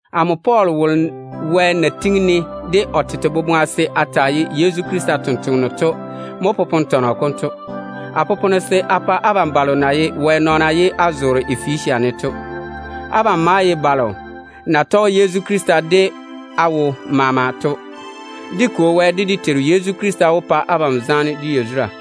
Amo Pɔɔl wolo Wɛ na tiŋi-ne de o tete boboŋa se a taa ye Yezu Krista totoŋa nakwe to mo popone tɔnɔ konto. A popone se a pa abam balo na ye Wɛ nɔɔna ye á zoore Efesia ne to. Abam maa ye balo na tɔge Yezu Krista de á wo maama to. Dé Kwo Wɛ, de dé Teiru Yezu Krista wó pa abam zaane de yazura.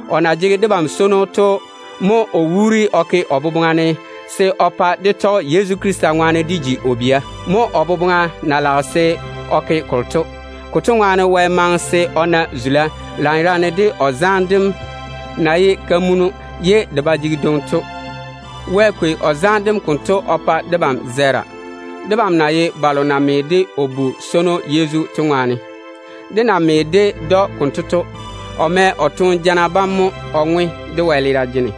O na jege debam swono to mo o wuuri o ke o boboŋa ne se o pa dé tɔge Yezu Krista ŋwaane dé ji o bia. Mo o boboŋa na lage se o ke kolo to. Konto ŋwaane Wɛ maŋe se o na zula lanyerane de o zaane dem na ba jege dwoŋi to. Wɛ kwei o zaane dem konto o pa debam zɛɛra, dé na ye balo na me de o Bu-swono Yezu to ŋwaane. Dé na me ded‑o konto to, o mɛ o toone jana bam mo o ŋwe dé wɛleera jene,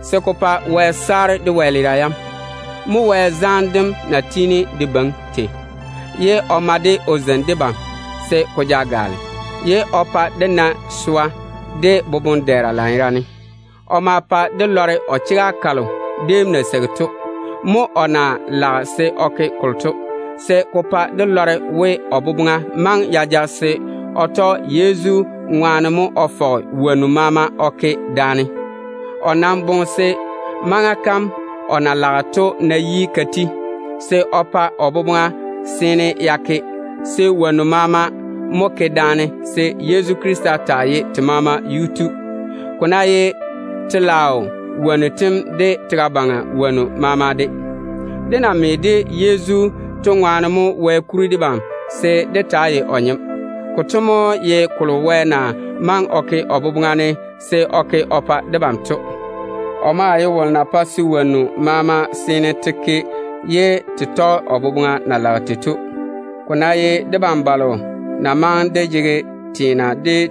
se ko pa Wɛ saare dé wɛleera yam. Mo Wɛ zaane dem na tiini de beiŋi tei, ye o ma-de o zeini debam se ko ja gaale, ye o pa dé na swa de yi-poro lanyerane. O ma pa dé lɔre o chega kalo déem na seigi to. Mo o na lage se o ke kolo to, se ko pa dé lɔre we, o boboŋa maŋe ya ja se o tɔge Yezu ŋwaane mo o fɔge wonnu maama o ke daane. O nam boŋe se, maŋa kam o na lage to ná yi ka ti, se o pa o boboŋa seene ya ke, se wonnu maama mo ke daane se Yezu Krista taa ye te maama yuu tu, ko ná ye telaao wonnu tem, de tega baŋa wonnu tem maama de. Dé na me de Yezu to ŋwaane mo Wɛ kuri debam se dé taa ye o nyem. Konto mo ye kolo Wɛ na maŋe o ke o boboŋa ne se o ke o pa debam to. O maa ye wolo na pae se wonnu maama yɔɔre te ke nenɛɛne o boboŋa na lage tei to. Ko ná ye debam balo na dɛ yiga dé kwei dé teena dé daŋe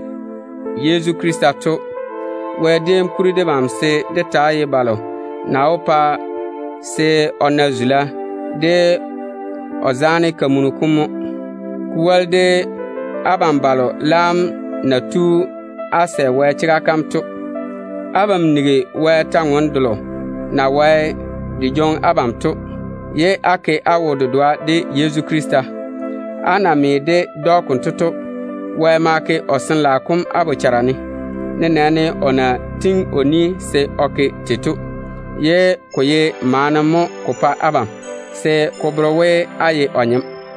Yezu Krista baŋa ne to, Wɛ déem kuri debam se dé taa ye balo na wó pa o na zula o nenɔŋ-fɔrɔ kom ŋwaane to mo. Ko woli de abam balo laam na tu á sɛ Wɛ chega kam to, abam nigi Wɛ kwor-ywoŋa kalo na pɛ á na verem to, ye á ke á wo-dedoa de Yezu Krista. Á na me ded‑o konto to, Wɛ ma ke o Sin-laao kom á bochara ne, nenɛɛne o na pwooli se o ke tei to, ye ko ye maana mo ko pa abam se ko bere we á seene á ye o nyem.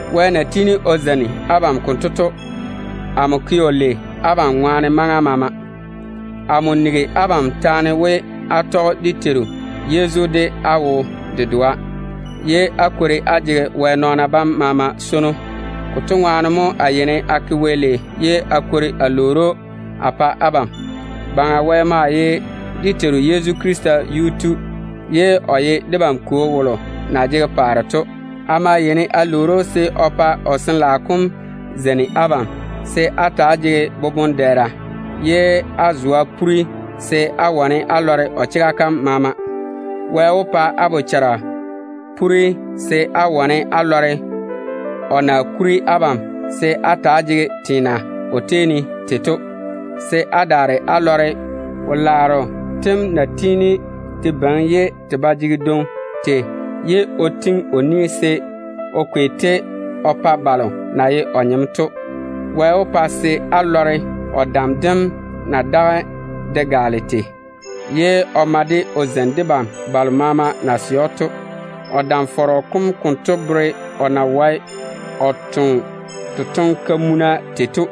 Wɛ na tiini o zeini abam konto to, amo yeini a ke‑o lei abam ŋwaane maŋa maama. Amo nigi abam taane we, á tɔge dé Teiru Yezu de á wo-dedoa, ye á kwori á jege Wɛ nɔɔna bam maama swono. Konto ŋwaane mo a ke Wɛ lei ye a kwori a lwoori‑o a pa abam. Baŋa Wɛ maa ye dé Teiru Yezu Krista Yuu-tu, ye o ye debam Kwo wom na jege paare telaao ne to. A maa yeini a lwoori‑o se o tɔge o Sin-laao kom baŋa o zeini abam de swa de boboŋ-dɛɛra, se á wane á lɔre o chega kam maama. Wɛ wó pa á yia poore se á wane á lɔre o na kuri abam se á ta‑á jege teena o tei ne tei to, se á daare á lɔre o wo-laaro tem na tiini te beiŋi tei ye o tiŋi o ni se o kwei-te o pa balo na ye o nyem to. Wɛ wó pa se á lɔre o dam dem na daga de gaale tei, ye o ma-de o zeini debam balo maama na sɛ‑o to. O dam-fɔrɔ kom konto bere o na wae o toŋe totoŋ-kamunnu tei to.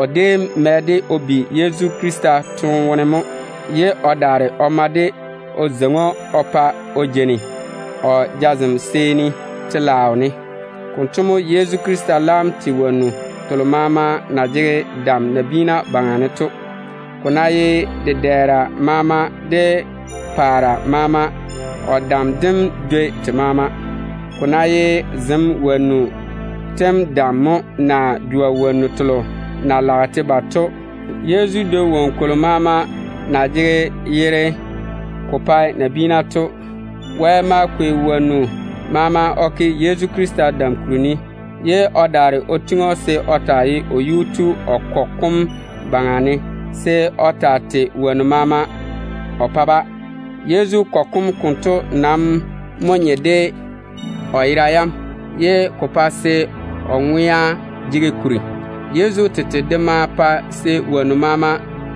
O déem mɛ-de o bi Yezu Krista toone wone mo, ye o daare o ma-de o zeiŋi‑o o pa o jeini o jazem seeni telaao ne. Konto mo Yezu Krista laam tei wonnu telo maama na jege dam nabiina baŋa ne to. Ko ná ye dedɛɛra maama, de paare maama, o dam dem dwoi te maama. Ko ná ye zem wonnu tem dam mo, naa jwa wonnu telo na lage te ba to, Yezu dwoi woŋo kolo maama na jege yere ko pa nabiina to. Wɛ ma kwei wonnu maama o ke Yezu Krista dam kuri ne, ye o daare o tiŋi‑o se o taa ye o kɔgɔ kom yuu tu, se o taa tei wonnu maama o pa-ba. Yezu kɔgɔ kom konto nam mo nye de o yera yam, ye ko pae se o ŋwea jege kuri. Yezu tete de maa pae se woŋo maama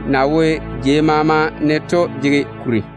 na wo jei maama ne to jege kuri.